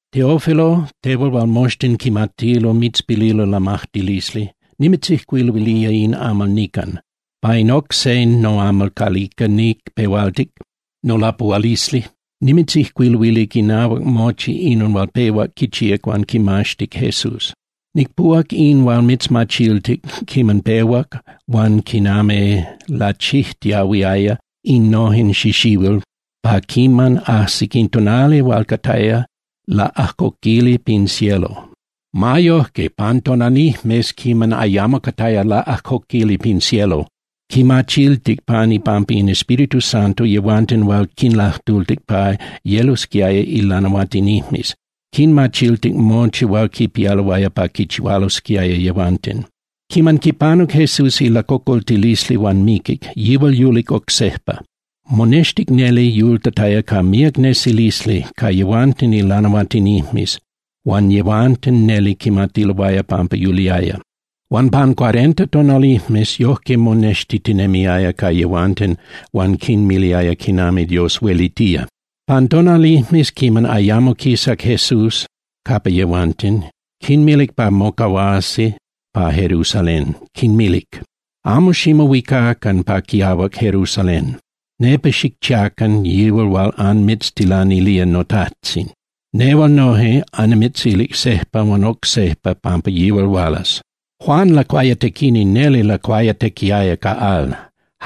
Teófilo, tehual hual moxtin quimatilo mitzpililo lamajtilisli, nimitzijcuiluilía in amal nican. Pa in oc se noamal calica nicpehualtic nolapuhualisli, nimitzijcuiluilic inahuac mochi inon hual pehuac quichíac huan quimaxtic Jesús. Nicpuhuac in hual mitzmachiltic quiman pehuac huan quinami lachijtiahuiaya innojen xixihuil pa quiman ajsic in tonali hual cataya laꞌajcoquili pin cielo. Ma yojque, pan tonalijmes quiman ayamo cataya laꞌajcoquili pin cielo, quinmachiltic pan ipampa in Espíritu Santo yehuanten hual quinlajtultic pa yelosquiaya ilanahuatinijmes, quinmachiltic mochi hual quipialoaya pa quichihualosquiaya yehuanten. Quiman panuc Jesús ilacocoltilisli huan miquic, yihual yulic oc sejpa. Monextic neli yultataya ca míac nesilisli ca yehuanten ilanahuatinijmes huan yehuanten neli quimatiloaya pampa yuliaya. Huan pan cuarenta tonalijmes yojque monextitinemiaya ca yehuanten huan quinmiliaya quinami Dios huelitía. Pan tonalijmes quiman ayamo quisac Jesús capa yehuanten, quinmilic pa mocahuasi pa Jerusalén, quinmilic: —Amo ximohuicacan pa quiahuac Jerusalén. Nepa xicchiacan yihual hual anmitztilanilía noTajtzin. Nehual noje annimitzilic sejpa huan oc sejpa pampa yihual hualas. Juan Lacuayatequini neli lacuayatequiaya ca al.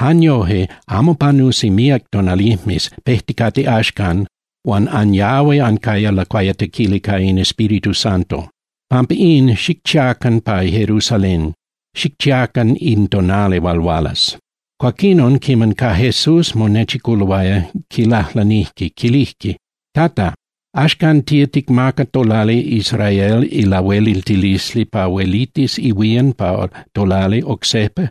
Jan yoje, amo panusi míac tonalijmes pejticate axcan huan anyahui ancaya lacuayatequili ca in Espíritu Santo. Pampa in, xicchiacan pa Jerusalén, xicchiacan in tonali hual hualas. Cuaquinon, quiman ca Jesús monechiculoaya, quilajlanijque, quilijque: —Tata, ¿axcan tía ticmaca tolali Israel ilahueliltilisli pa huelitis ihuían pa tolali oc sejpa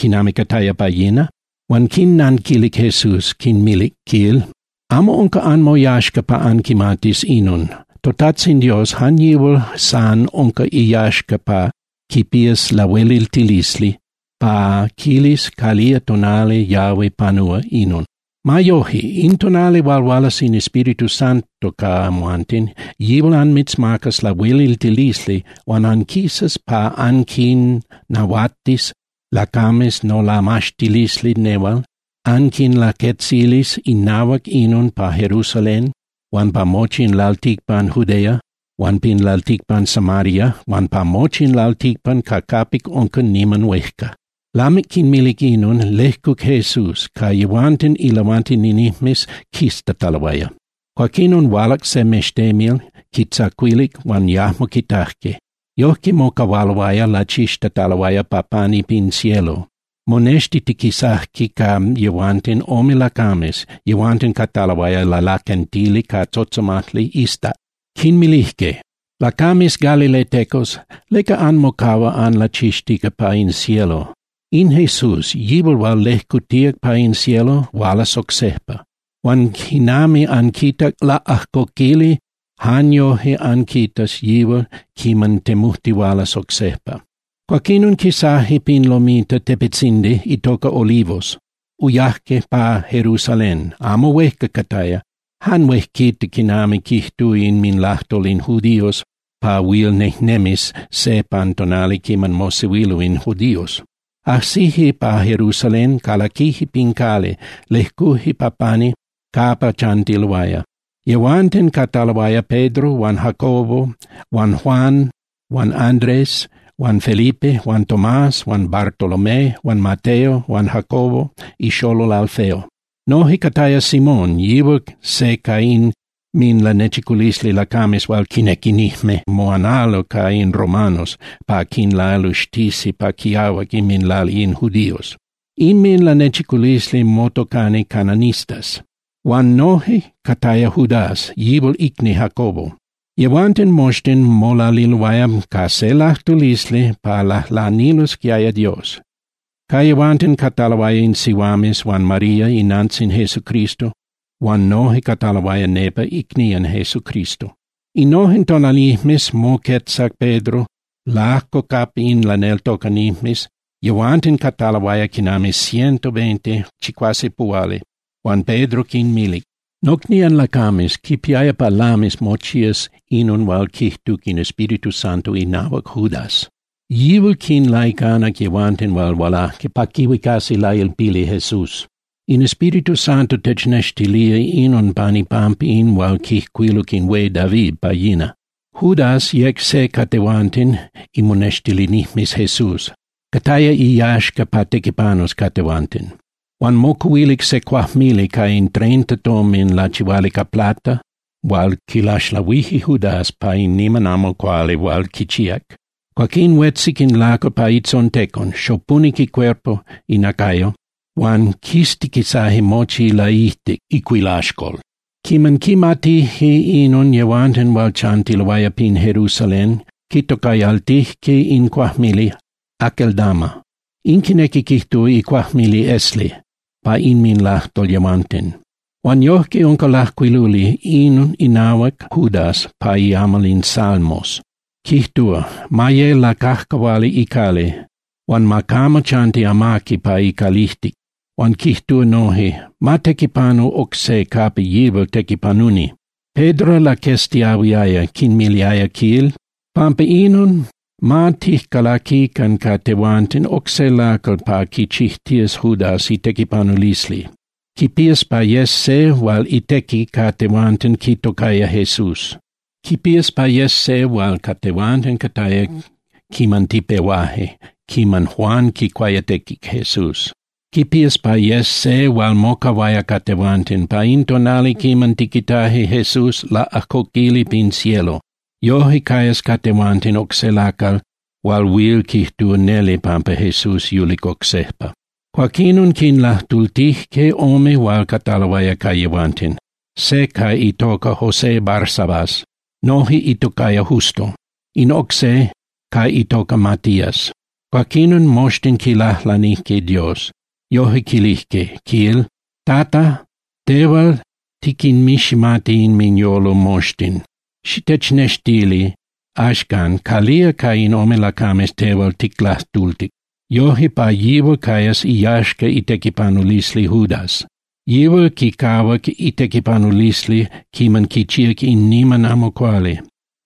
quinami cataya pa yina? Huan quinnanquilic Jesús, quinmilic, quil: —Amo unca anmoyaxca pa anquimatis inon. ToTajtzin Dios, jan yihual san unca iyaxca huan quipía lahueliltilisli pa quilis calía tonali yahui panúa inon. Ma yoje, in tonali hual hualas in Espíritu Santo ca amhuanten, yihual anmitzmacas lahueliltilisli huan anquisas pa anquinnahuatis lacames nolamaxtilisli nehual, anquinlaquetzilis inahuac inon pa Jerusalén huan pa mochi in lalticpan Judea huan pin lalticpan Samaria huan pa mochi in lalticpan ca capic unca niman huejca. Lamic quinmilic inon, lejcuc Jesús ca yehuanten ilanahuatinijmes quiztataloaya. Cuaquinon hualac se mextemil, quitzacuilic, huan yajmo quitajque. Yojque mocahualoaya lachixtataloaya pa pani pin cielo, monextitiquisajque ca yehuanten ome lacames, yehuanten cataloaya lalaquentili ca tzotzomajli iztac. Quinmilijque: —Lacames galiletecos, ¿leca anmocahua anlachixtica pa in cielo? In Jesús, yihual hual lejcutíac pa in cielo, hualas oc sejpa. Huan quinami anquitac laꞌajcoquili, jan yojque anquitas yihual quiman temujtihualas oc sejpa. Cuaquinon quisaje pin lomita (tepetzindi) itoca Olivos, uyaje pa Jerusalén, amo huejca cataya, jan huejquita quinami quijtúa inminlajtol in judíos pa huil nejnemis se pan tonali quiman mosehuilo in judíos. Ajsije pa Jerusalén, calaquije pin cali, lejcuje pa pani capa chantiloaya. Yehuanten cataloaya Pedro huan Jacobo huan Juan huan Andrés huan Felipe huan Tomás huan Bartolomé huan Mateo huan Jacobo ixolol Alfeo. Noje cataya Simón, yihual se ca inminlanechiculisli lacames hual quinequinijme moanalo ca in romanos pa quinlaluxtisi pa quiahuac inminlali in judíos. Inminlanechiculisli motocani cananistas. Huan noje cataya Judas, yihual icni Jacobo. Yehuanten moxtin molaliloaya ca se lajtulisli pa lajlanilosquiaya Dios. Ca yehuanten cataloaya in sihuames huan María inantzin Jesucristo huan noje cataloaya nepa icnían Jesucristo. Innojen tonalijmes moquetzac Pedro lajco capa in laneltocanijmes, yehuanten cataloaya quinami ciento veinte (chicuasepuhuali), huan Pedro quinmilic: —Nocnían lacames, quipiaya pa lamis mochías inon hual quijtuc in Espíritu Santo inahuac Judas. Yihual quinlaicanac yehuanten hual hualaje pa quihuicasi lailpili Jesús. In Espíritu Santo technextilía inon pan ipampa in hual quijcuiluc in hué David pa yina. Judas yec se ca tehuanten imonextilinijmes Jesús, cataya iyaxca pa tequipanus ca tehuanten. Huan mocuhuilic se cuajmili ca in treinta tomin lachihuali ca plata hual quilaxlahuije Judas pa in niman amo cuali hual quichíac. Cuaquín huetzic in lacal pa itzontecon, xopunic icuerpo (inacayo) huan quistiquisaje mochi ilaijtic (icuilaxcol). Quiman quimatijque inon yehuanten hual chantiloaya pin Jerusalén, quitocayaltijque in cuajmili Aceldama. In quinequi quijtúa iCuajmili Esli pa inminlajtol yehuanten. Huan yojque unca lajcuiluli inon inahuac Judas pa iamal in Salmos, quijtúa: Ma ye lacajcahuali icali, huan ma camo chanti amaqui pa icalijtic. Huan quijtúa noje: Ma tequipanu oc se capa yihual tequipanuni. Pedro laqueztiahuiaya, quinmiliaya, quil: —Pampa inon, ma tijcalactican ca tehuanten oc se lacal pa quichijtías Judas itequipanulisli. Quipías pa yes se hual itequi ca tehuanten quitocaya Jesús. Quipías pa yes se hual ca tehuanten cataya quiman tipehuaje, quiman Juan quicuayatequic Jesús. Quipías pa yes se hual mocahuaya ca tehuanten pa in tonali quiman tiquitaje Jesús laꞌajcoquili pin cielo. Yoje cayas ca tehuanten oc se lacal hual huil quijtúa neli pampa Jesús yulic oc sejpa. Cuaquinon quinlajtultijque ome hual cataloaya ca yehuanten, se ca itoca José Barsabas, noje itocaya Justo, in oc se ca itoca Matías. Cuaquinon, moxtin quilajlanijque Dios, yoje quilijque, quil: —Tata, tehual tiquinmiximati inminyolo moxtin. Xitechnextili axcan calía ca in ome lacames tehual ticlajtultic. Yoje, pa yihual cayas iyaxca itequipanulisli Judas. Yihual quicahuac itequipanulisli quiman quichíac in niman amo cuali.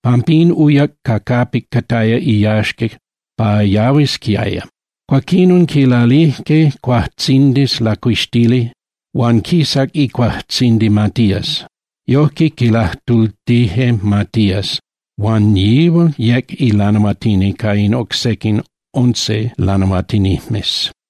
Pampín uyac ca capic cataya iyaxca pa yahuisquiaya. Cuaquinon quilalijque cuajtzindis lacuixtili huan quisac icuajtzindi Matías. Yojque quilajtultije Matías, huan yihual yec lanahuatini ca in oc sequin once lanahuatinijmes.